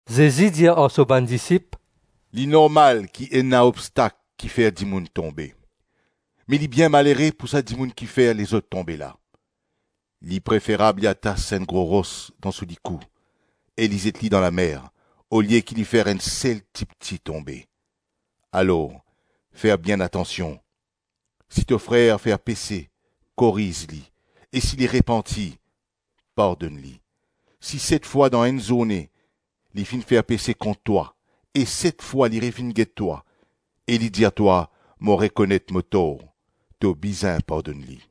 Zezi dir ar so bann disip, “Li normal ki ena obstak ki fer dimoun tonbe, me li bien malere pou sa dimoun ki fer lezot tonbe la! Li preferab li atas enn gro ros dan so likou e li zet li dan lamer olie ki li fer enn sel tipti tonbe. Alor, fer bien atansion. Si to frer fer pese, koriz li, e si li repanti, pardonn li. Si set fwa dan enn zourne, li finn fer pese kont twa e set fwa li revinn get twa, e li dir twa, ‘Mo rekonet mo tor’, to bizin pardonn li.”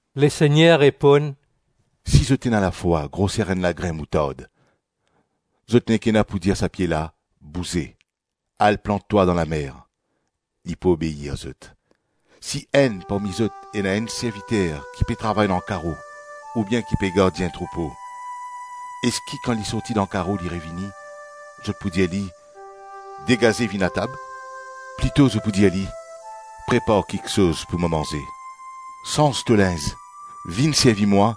Lesegner reponn, “Si zot ena lafwa groser enn lagrin moutard, zot nek ena pou dir sa pie la, ‘Bouze, al plant twa dan lamer,’ li pou obeir zot.” “Si enn parmi zot ena enn serviter ki pe travay dan karo oubien ki pe gardien troupo, eski kan li sorti dan karo li revini, zot pou dir li, ‘Degaze vinn atab’? Plito zot pou dir li, ‘Prepar kiksoz pou mo manze, sanz to linz, vinn servi mwa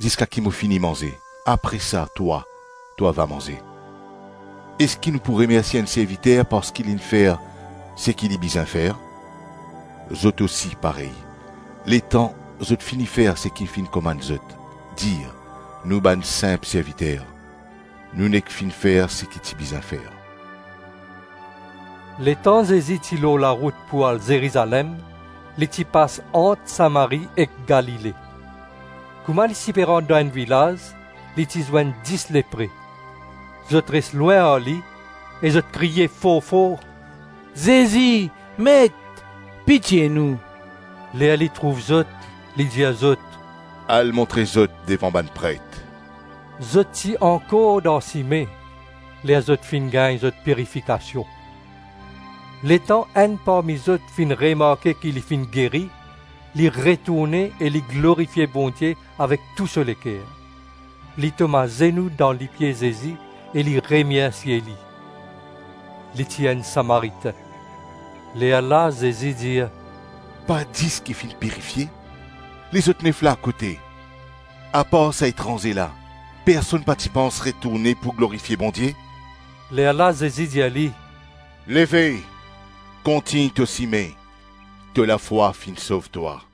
ziska ki mo fini manze; apre sa, twa, to ava manze.’ Eski nou pou remersie enn serviter parski li finn fer seki li bizin fer? Zot osi parey. Letan zot fini fer seki finn komann zot, dir, ‘Nou bann sinp serviter, nou nek finn fer seki ti bizin fer.’” Letan Zezi ti lor larout pou al Zerizalem, li ti pas ant Samari ek Galile. Kouma li ti rant dan enn vilaz li ti zwenn dis lepre. Zot res lwin ar li e zot kriye for-for, “Zezi! Met! Pitie nou.” Ler li trouv zot, li dir zot, “Al montre zot devan bann pret.” Zot ti ankor dan sime, ler zot finn gagn zot pirifikasion. Letan enn parmi zot finn remarke ki li finn geri, li retourne e li glorifie Bondie avek tou so leker. Li tom azenou dan lipie Zezi e li remersie li. Li ti enn Samaritin. Lerla Zezi dir, “Pa dis ki finn pirifie? Lezot nef la kote? Apar sa etranze la, personn pa ti pans retourne pou glorifie Bondie?” Lerla Zezi dir li, “Leve, kontign to sime, to lafwa finn sov twa.”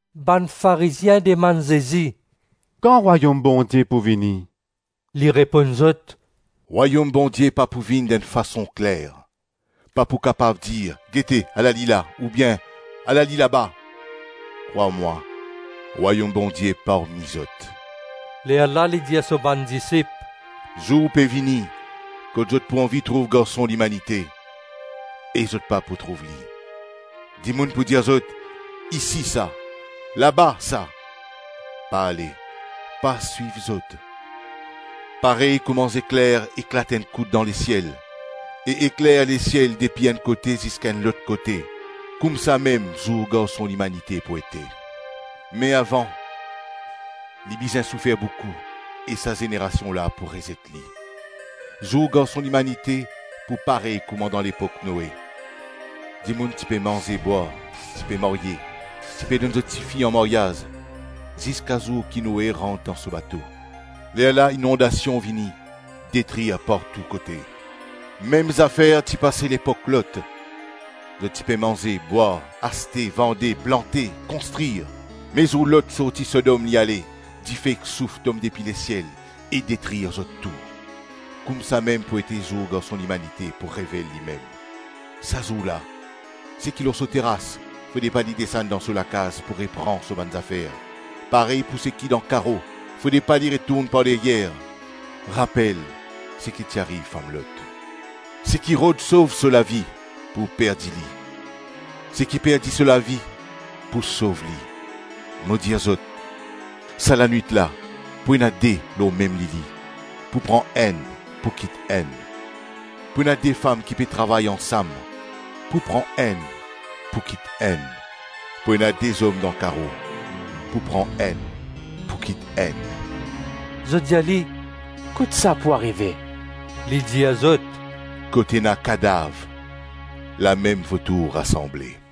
Bann Farizien dimann Zezi, “Kan Rwayom Bondie pou vini?” Li reponn zot, “Rwayom Bondie pa pou vinn dan enn fason kler. Pa pou kapav dir, ‘Gete, ala li la!’ oubien, ‘Ala li laba!’ Krwar mwa, Rwayom Bondie parmi zot.” Lerla li dir so bann disip, “Zour pe vini kot zot pou anvi trouv Garson Limanite, e zot pa pou trouv li. Dimoun pou dir zot, ‘Isi sa! Laba sa!’ Pa ale, pa swiv zot. Parey kouma zekler eklat enn kout dan lesiel e ekler lesiel depi enn kote ziska enn lot kote, koumsamem zour Garson Limanite pou ete. Me avan, li bizin soufer boukou e sa zenerasion la pou rezet li. Zour Garson Limanite pou parey kouma dan lepok Noe. Dimoun ti pe manze-bwar, ti pe marye, ti pe donn zot tifi an maryaz, ziska zour ki Noe rant dan so bato; lerla inondasion vini, detrir partou kote. Mem zafer ti pase lepok Lot. Zot ti pe manze, bwar, aste, vande, plante, konstrir; me zour Lot sorti Sodom li ale, dife ek souf tom depi lesiel e detrir zot tou. Koumsamem pou ete zour Garson Limanite pou revel limem. Sa zour la, seki lor so teras, fode pa li desann dan so lakaz pou repran so bann zafer; parey pou seki dan karo, fode pa li retourn par deryer. Rapel seki ti ariv fam Lot. Seki rod sov so lavi pou perdi li, seki perdi so lavi pou sov li. Mo dir zot, sa lanwit la pou ena de lor mem lili; pou pran enn, pou kit enn. Pou ena de fam ki pe travay ansam; pou pran enn, pou kit enn. Pou ena de zom dan karo; pou pran enn, pou kit enn.” Zot dir li, “Kot sa pou arive?” Li dir zot, “Kot ena kadav, lamem votour rasanble.”